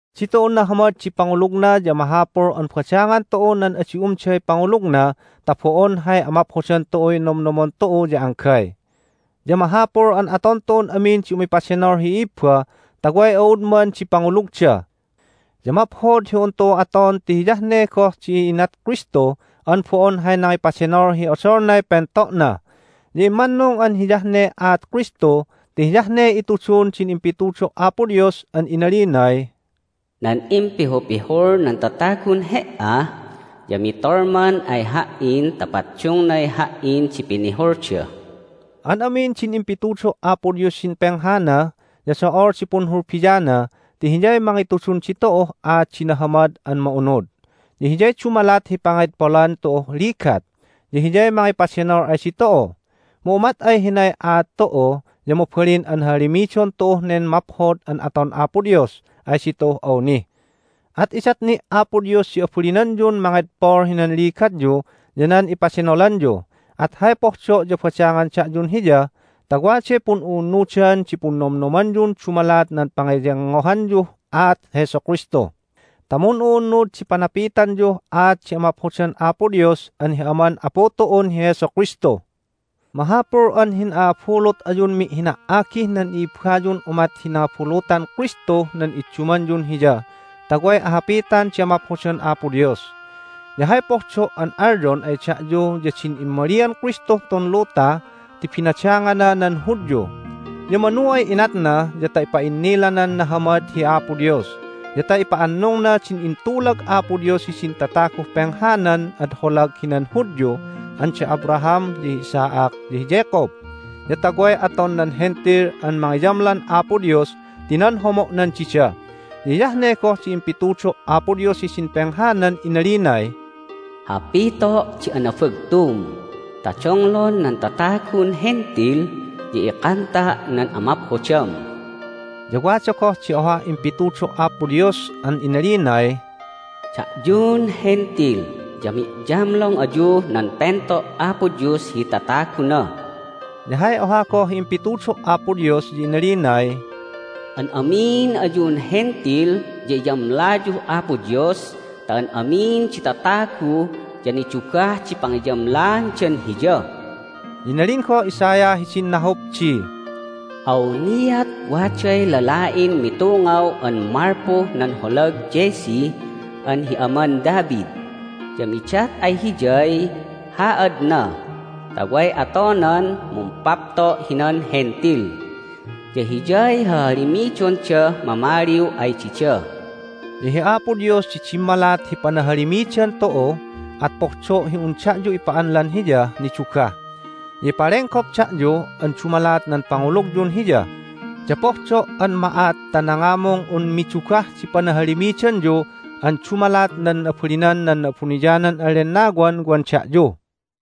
Ditu'un nahamad di pangulugna ya mahapul an badangan tu'u nan adi umday pangulugna ta bo'on hay amaphodan tu'uy nomnomon tu'u ya anggay. Ya mahapul an aton tu'un amin di umipadenol hi i'ibba ta way a'udman di pangulugda. Ya maphod hi un tu'u aton ti hiyah ne goh di inat Kristu an bo'on hay nangipadenol hi odolnay pento'na. Ya immannung an hiyah ne aat Kristu ti hiyah ne itudun din impitudo' Apo Dios an inalinay, "Nan impihupihul nan tatagun He"a ya mitolman ay Ha"in ta paddungnay Ha"in di pinihulda." An amin din impitudo' Apo Dios hidin penghana ya do'ol di punhulbiana ti hiyay mangitudun ditu'uh aat di nahamad an ma'unud. Ya hiyay dumalat hi pangedpolan tu'uh ligat, ya hiyay mangipadenol ay ditu'u. Mu umat ay hinay aat tu'u ya mabalin an hahalimidon tu'uh nen maphod an aton Apo Dios ay ditu'uh awni. At idat ni' Apo Dios di abalinanyun mangedpol hinan ligatyu ya nan ipadenolanyu. At hay pohdo' ya badangan da'yun Hiya ta waday pun'u'unnudan di punnomnomanyun dumalat nan pangeyengngohanyuh aat Jesu Kristu ta mun'u'unnud di panapitanyuh aat di amaphodan Apo Dios an hi Aman Apu tu'un hi Jesu Kristu. Mahapul an hin'a'abulut ayun mi'hina"agih nan i'ibbayun umat hi nangabulutan Kristuh nan iddumanyun Hiya ta way ahapitan di amaphodan Apo Dios. Ya hay pohdo' an alyon ay da'yu ya din immalian Kristuh tun luta ti binadangana nan Hudyu. Ya manu ay inatna ya ta ipa'innilanan nahamad hi Apo Dios, ya ta ipa'annungna din intulag Apo Dios hidin tataguh penghanan ad holag hinan Hudyu an da Abraham, ya hi Isaac, ya hi Jacob, ya ta way aton nan Hentil an mangiyamlan Apo Dios ti nan homo'nan dida. Ya hiyah ne goh di impitudo' Apo Dios hidin penghanan inalinay, "Hapito' di anabagtum ta donglon nan tatagun Hentil, ya ikanta' nan amaphodam." Ya wada goh di ohah impitudo' Apo Dios an inalinay, "Da'yun Hentil ya mi'yamlong ayuh nan pento' Apo Dios hi tataguna." Ya hay oha goh hi impitudo' Apo Dios ya inalinay, "An amin ayun Hentil ya iyamlayuh Apo Dios ta an amin di tatagu ya nidugah di pangiyamlaandan Hiya!" Ya inalin goh Isaiah hidin nahup di, "Awniat waday lala'in mitungaw an malpuh nan holag Jesse an hi aman David, ya midat ay Hiyay haadna ta way atonan mumpapto' hinan Hentil. Ya Hiyay hahalimidondah mamaliw ay dida." Ya hi Apo Dios di dimmalat hi panahalimidan tu'u, at pohdo' hi un da'yu ipa'anlan Hiyah nidugah. Ya ipalenggop da'yu an dumalat nan pangulugyun Hiya, ya pohdo' an ma'at ta nangamung un midugah di panahalimidanyu an dumalat nan abalinan nan Na'abuniyanan an Lennawan wan da'yu.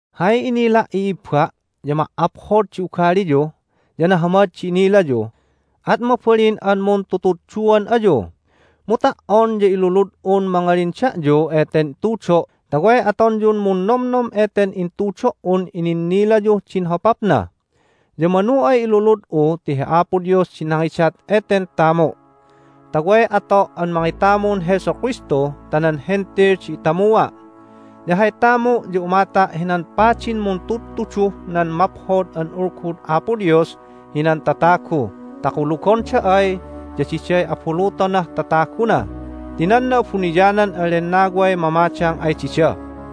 Hay inila', i'ibba', ya ma"aphod di ugaliyu, ya nahamad di inilayu, at mabalin an muntutudduan ayu. Mu ta"on ya ilulud'un mangalin da'yu eten tudo' ta way atonyun munnomnom eten intudo"un ininnilayuh din hopapna. Ya manu ay ilulud'u ti hi Apo Dios di nangidat eten tamu' ta way ato' an mangitamun Jesu Kristu ta nan Hentil di itamua'. Ya hay tamu' ya umata' hinan padin muntudtuduh nan Maphod an Ulgud Apo Dios hinan tatagu ta kulugonda ay ya diday abulutonah tataguna ti nan Na'abuniyanan an Lennaway mamadang ay dida.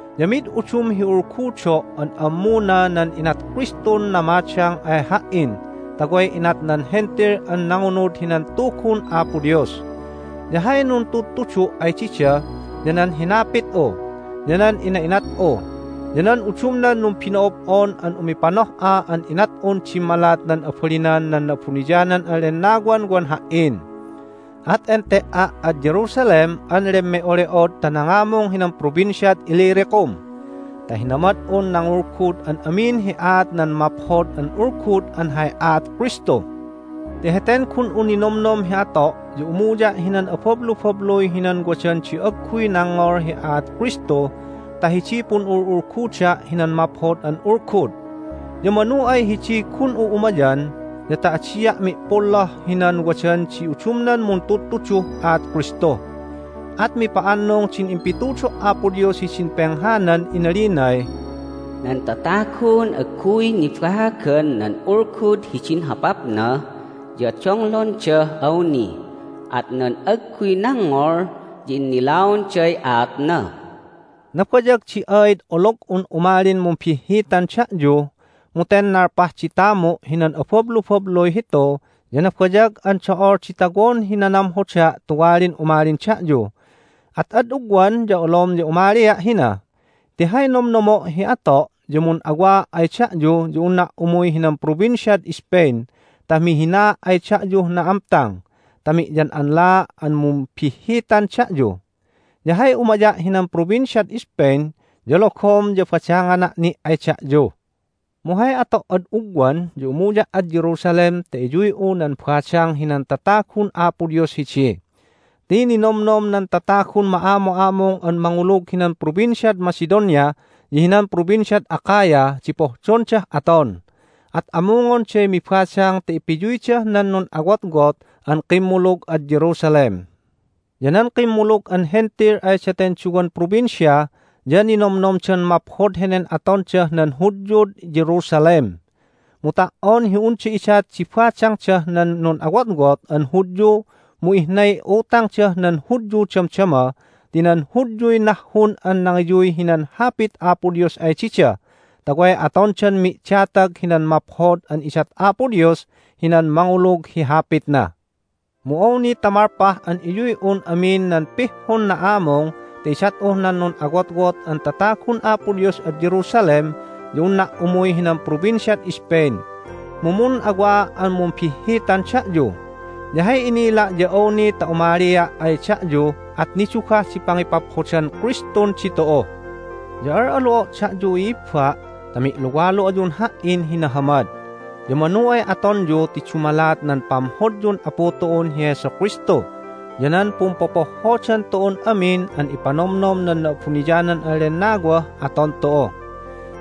Ya mid udum hi ulgudo' an ammuna nan inat Kristun namadang ay ha"in ta way inat nan Hentil an nangunud hinan Tugun Apo Dios. Ya hay nanudtudu' ay dida ya nan hinapit'u, ya nan ina'inat'u, ya nan udumnan numbino'ob'on an umipanoh'an inat'un dimmalat nan abalinan nan Na'abuniyanan an Lennawan wan ha"in. At ente"a' ad Jerusalem an lemme'ole'od ta nangamung hinan Provinciad Illyricum, ta hinamad'un nangulgud an amin hi aat nan Maphod an Ulgud an hay aat Kristu. Ti heten gun'u ninomnom hi ato' ya umuya' hinan abablubabluy hinan wadan di agguy nangngol hi aat Kristu ta hidiy pun'ul'ulguda' hinan Maphod an Ulgud. Ya manu ay hidiy gun'u umayan ya ta adia' mi'polloh hinan wadan di udumnan muntudtuduh aat Kristu. At mipa'annung din impitudo' Apo Dios hidin penghanan inalinay, "Nan tatagun agguy nibaagan nan ulgud hidin hopapna ya donglondah awni, at nan agguy nangngol ya innilaonday aatna." Nabayag di aid olog'un umalin mumbihhitan da'yu. Mu ten nalpah di tamu' hinan abablubabluy hitu ya nabayag an do'ol di tawon hi nanamhoda' tuwalin umalin da'yu. At ad ugwan ya olom ya umalia' hina. Ti hay nomnomo' hi ato' ya mun'awaa' ay da'yu ya unna' umuy hinan Provinciad Spain ta mi'hinaa' ay da'yuh na'amtang ta mi'yan'anlaa' an mumbihhitan da'yu. Ya hay umaya' hinan Provinciad Spain ya logom ya badangana' ni' ay da'yu. Mu hay ato' ad ugwan ya umuya' ad Jerusalem ta iyuy'u nan badang hinan tatagun Apo Dios hidi. Ti ninomnom nan tatagun ma'amu'amung an mangulug hinan Provinciad Macedonia ya hinan Provinciad Achaia di pohdondah aton. At amungonday mibadang ta ipiyuydah nan nun'awotwot an kimmulug ad Jerusalem. Ya nan kimmulug an Hentil ay daten duwan provincia ya ninomnomdan maphod henen atondah nan Hudyud Jerusalem. Mu ta"on hi unda idat di badangdah nan nun'awotwot an Hudyu mu ihnay utangdah nan Hudyu damdama ti nan Hudyuy nahhun an nangiyuy hinan Hapit Apo Dios ay dida ta way atondan mi'datag hinan maphod an idat Apo Dios hinan mangulug hi Hapitna. Mu awni ta malpah an iyuy'un amin nan pihhun na'amung ta idat'uh nan nun'awotwot an tatagun Apo Dios ad Jerusalem ya unna' umuy hinan Provinciad Spain, mu mun'awaa' an mumbihhitan da'yu. Ya hay inila' ya awni ta umalia' ay da'yu at nidugah di pangipaphodan Kristun ditu'u. Ya al'alu'o' da'yu, i'ibba', ta mi'luwalu ayun ha"in hi nahamad. Ya manu ay atonyu ti dumalat nan pamhodyun Apu tu'un hi Jesu Kristu ya nan pumpopohhodan tu'un amin an ipanomnom nan Na'abuniyanan an Lennawah aton tu'u.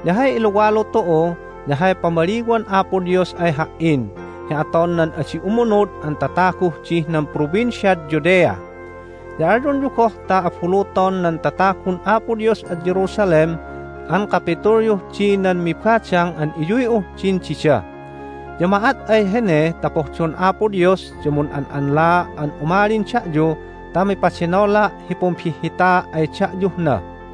Ya hay iluwalu tu'u ya hay pamaliwan Apo Dios ay ha"in hi aton nan adi umunud an tataguh dih nan Provinciad Judea. Ya alyonyu goh ta abuluton nan tatagun Apo Dios ad Jerusalem an kapitulyuh di nan mibadang an iyuy'uh din dida. Ya ma'at ay hene ta pohdon Apo Dios ya mun'an'anlaa' an umalin da'yu ta mipadenola' hi pumbihhitaa' ay da'yuh na.